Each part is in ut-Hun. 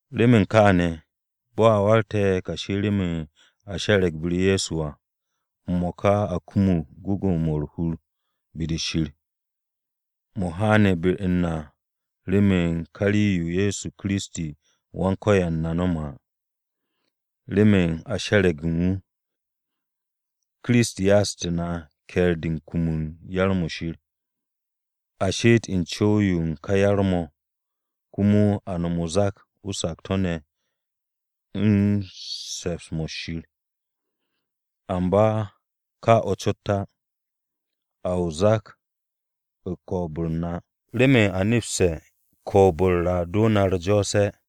Remen kaane̱, bo̱ a warge̱ kashi remen a she̱re̱g be-u̱r Ye̱so à, m-mo̱ka a kumug gwu̱gwu̱-mo̱ u̱r-hur be-de Shir. Mo̱ haane̱ be-u̱r na remen ka rii-yo Ye̱so Kiristi Wan-Ko̱yan na nome̱ à. Remen a she̱re̱g u̱n wu̱, Kiristi ya'ag na ke̱e̱r-de u̱n kum u̱n yar-mo̱ Shir. A she'et u̱n co̱w-yo u̱n ka yar-mo̱ komo a no̱m o-zak u̱n sakto̱-o̱ u̱n se̱ps-mo̱ Shir. Amba ka o̱ cot á, a o-zak u̱n ko̱o̱b-u̱r na, remen a nepste̱ ko̱o̱b-u̱r a do na u̱r-jo̱o̱se̱.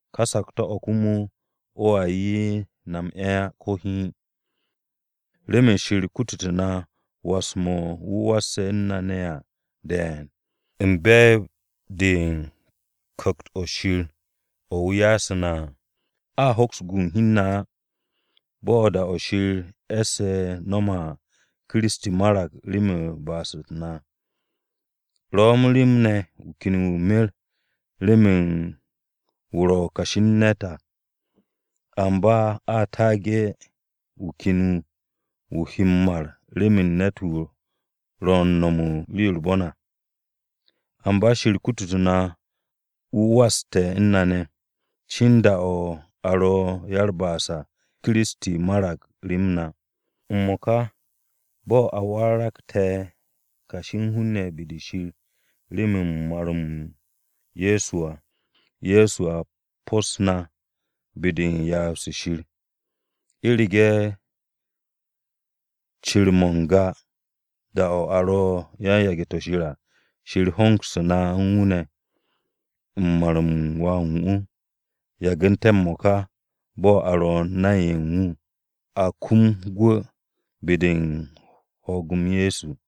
Ka sakto̱-o̱ komo o̱a 'ye na m-'e̱ á ko̱ hiin, remen Shir kutute̱ na was-mo̱ u̱n wu̱ wasse̱ u̱n na ne̱ à de̱e̱n, u̱n be̱e̱b-de u̱n Ku̱kt-o̱ Shir o̱ wu̱ ya'u̱ na à. A hoks m-gu hi u̱n na á. Bo̱ da-o̱ Shir e̱sse̱ no̱me̱ à, Kiristi marag remen ba'as-u̱t na. Ro̱ rem ne̱ wu̱ ken wu̱ mer remen wu̱ ro̱ kashi u̱n ne̱t à, amba a taage̱ u̱n wu̱ ken wu̱, wu̱ he m-mar remen ne̱t-wu̱ ro̱ u̱n no̱m u̱n rii-yo u̱r-bon à. Amba Shir kututu̱ na wu̱ waste̱ u̱n na ne̱, cin da-o̱ a ro ya-u̱t-ba'as à, Kiristi marag rem na. M-mo̱ka bo̱ a warage̱ kashi u̱n hun-ne̱ be-de Shir remen mar-m Ye̱so à, Ye̱so a ruut na be-de u̱n ryaab-se Shir. U̱rege̱ cir-mo̱ u̱n n-ga da-o̱ a ro u̱n yage̱-to̱ Shir à, Shir hongsu̱ na u̱n wu̱ ne̱, u̱n mar-m Wà u̱n wu̱. Yagu̱nte̱ m-mo̱ka bo̱ a ro̱ nay-ne̱ ye̱ u̱n wu̱ à, a kum gwu̱ be-de u̱n ho̱o̱g-m Ye̱so.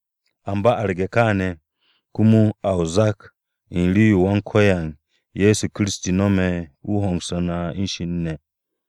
Amba arge̱ kaane̱, komo a o-zak u̱n rii-yo Wan-Ko̱yan Ye̱so Kiristi no̱me̱ wu̱ hongsu̱tu̱ na u̱n Shir ne̱ à.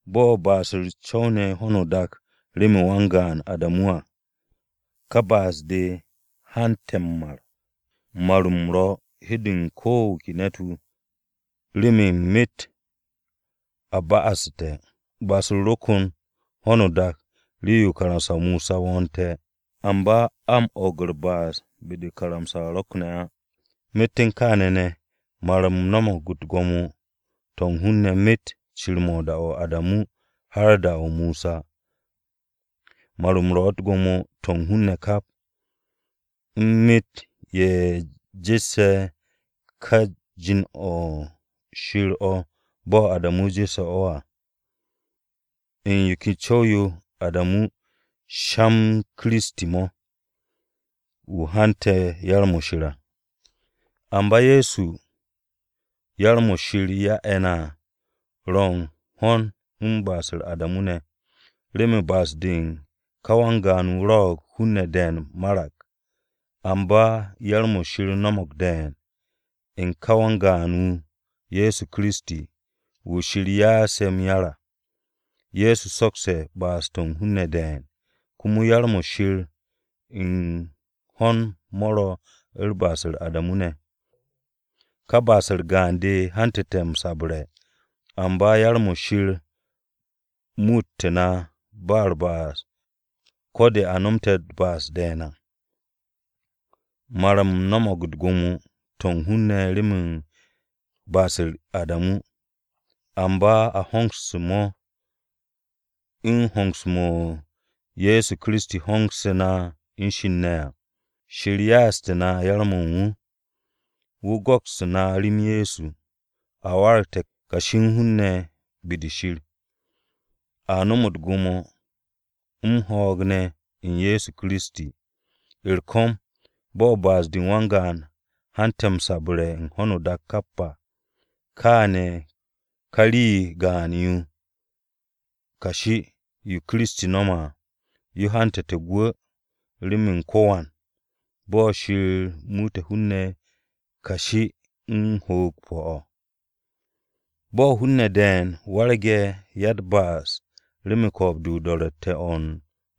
Bo̱ ba'as-u̱r co̱wne̱ u̱n ho̱no o-dak remen wan-gaan Adamu à, ka ba'as-de hante̱ m-mar. Mar-m ro̱ u̱n hi-de u̱n ko̱ wu̱ ke ne̱t-wu̱, remen myet a ba'asu̱te̱. Ba'as-u̱r ro kon u̱n ho̱no o-dak rii-yo karamsa-o Mosa wo̱o̱nte̱, amba a m-o̱o̱g u̱r-ba'as be-de karamsa-o rokne̱ á. Myet u̱n kaane̱ ne̱, mar-m no̱mo̱g u̱t-gwo̱mo to̱ u̱n hun-ne̱ myet cir-mo̱ u̱n da-o Adamu har da-o Mosa. Mar-m ro̱ u̱t-gwo̱mo to̱ u̱n hun-ne̱ kap, u̱n myet u̱n ye̱ jesse̱ ka jin-o̱ Shir bo̱ Adamu jesse̱ o̱ à. U̱n yo ken co̱w-yo Adamu sha-m Kiristi mo̱, wu̱ he hante̱ u̱n yar-mo̱ Shir à. Amba yar-mo̱ Shir ya'e̱ na à ro̱ u̱n ho̱n u̱n ba'as-u̱r Adamu ne̱. Remen ba'as-de u̱n ka wan-gaan-wu̱ rwo̱'o̱g hun-ne̱ de̱e̱n marag. Amba yar-mo̱ Shir no̱mo̱g de̱e̱n, u̱n ka wan-gaan-wu̱, Ye̱so Kiristi, wu̱ Shir ya'ase̱ m-yar à. Ye̱so sokste̱ ba'as-to̱ u̱n hun-ne̱ de̱e̱n. Komo yar-mo̱ Shir u̱n ho̱n mo̱ ro̱ u̱n ba'as-u̱r Adamu ne̱. Ka ba'as-u̱r gaan-de hantu̱te̱ m-sabre̱, amba yar-mo̱ Shir muutu̱ na ba u̱r-ba'as ko̱ de a no̱mte̱ u̱t-ba'as de̱e̱n à. Mar-m no̱mo̱g u̱t-gwo̱mo to̱ u̱n hun-ne̱ remen ba'as-u̱r Adamu. Amba a hongse̱ mo̱ u̱n hongse̱-mo̱ Ye̱so Kiristi hongse̱ na u̱n Shir ne̱ á. Shir ya'aste̱ na yar-mo̱ u̱n wu̱. Wu̱ go̱kste̱ na rem Ye̱so, a waragte̱ kashi u̱n hun-ne̱ be-de Shir. A nom u̱t-gwo̱mo m-ho̱o̱g ne̱ u̱n Ye̱so Kiristi ne̱. U̱r-ko̱m, bo̱ ba'as-de u̱n wan-gaan hante̱ o-sabre̱ u̱n ho̱no o-dak kap à, kaane̱ ka rii gaan-yo kashi, yo Kiristi no̱me̱ à, yo hante̱ gwu̱ remen ko̱wan, bo̱ Shir muute̱ hun-ne̱ kashi u̱n ho̱o̱g pu̱-o̱ à. Bo̱ hun-ne̱ de̱e̱n warge̱ ya-u̱t-ba'as remen ko̱o̱b-de o-do̱ro̱tte̱ o̱ u̱n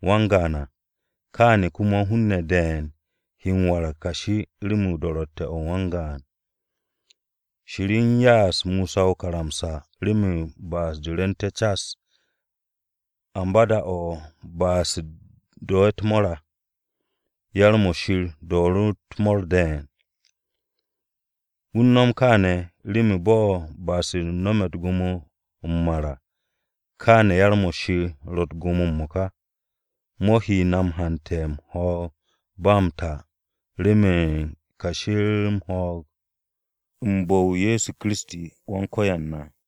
wan-gaan à, kaane̱ komo hun-ne̱ de̱e̱n he m-warag kashi remen do̱ro̱tte̱-o̱ u̱n wan-gaan. Shir u̱n ya'as Mosa o-karamsa remen ba'as-de rwu̱u̱nté̱ cas. Amba da-o̱ ba'as-u̱t do̱ u̱t-mo̱o̱r à, yar-mo̱ Shir do̱o̱ru̱ u̱t-mo̱o̱r de̱e̱n. Wu̱ u̱n nom kaane̱, remen bo̱ ba'as-u̱r no̱me̱ u̱t-gwo̱mo m-mar à, kaane̱ yar-mo̱ Shir ro̱ u̱t-gwo̱mo m-mo̱ka. Mo̱ he na m-hante̱ u̱n ho̱o̱g-o̱ ba m-ta remen kashi m-ho̱o̱g, u̱n bu̱-o Ye̱so Kiristi Wan-Ko̱yan na.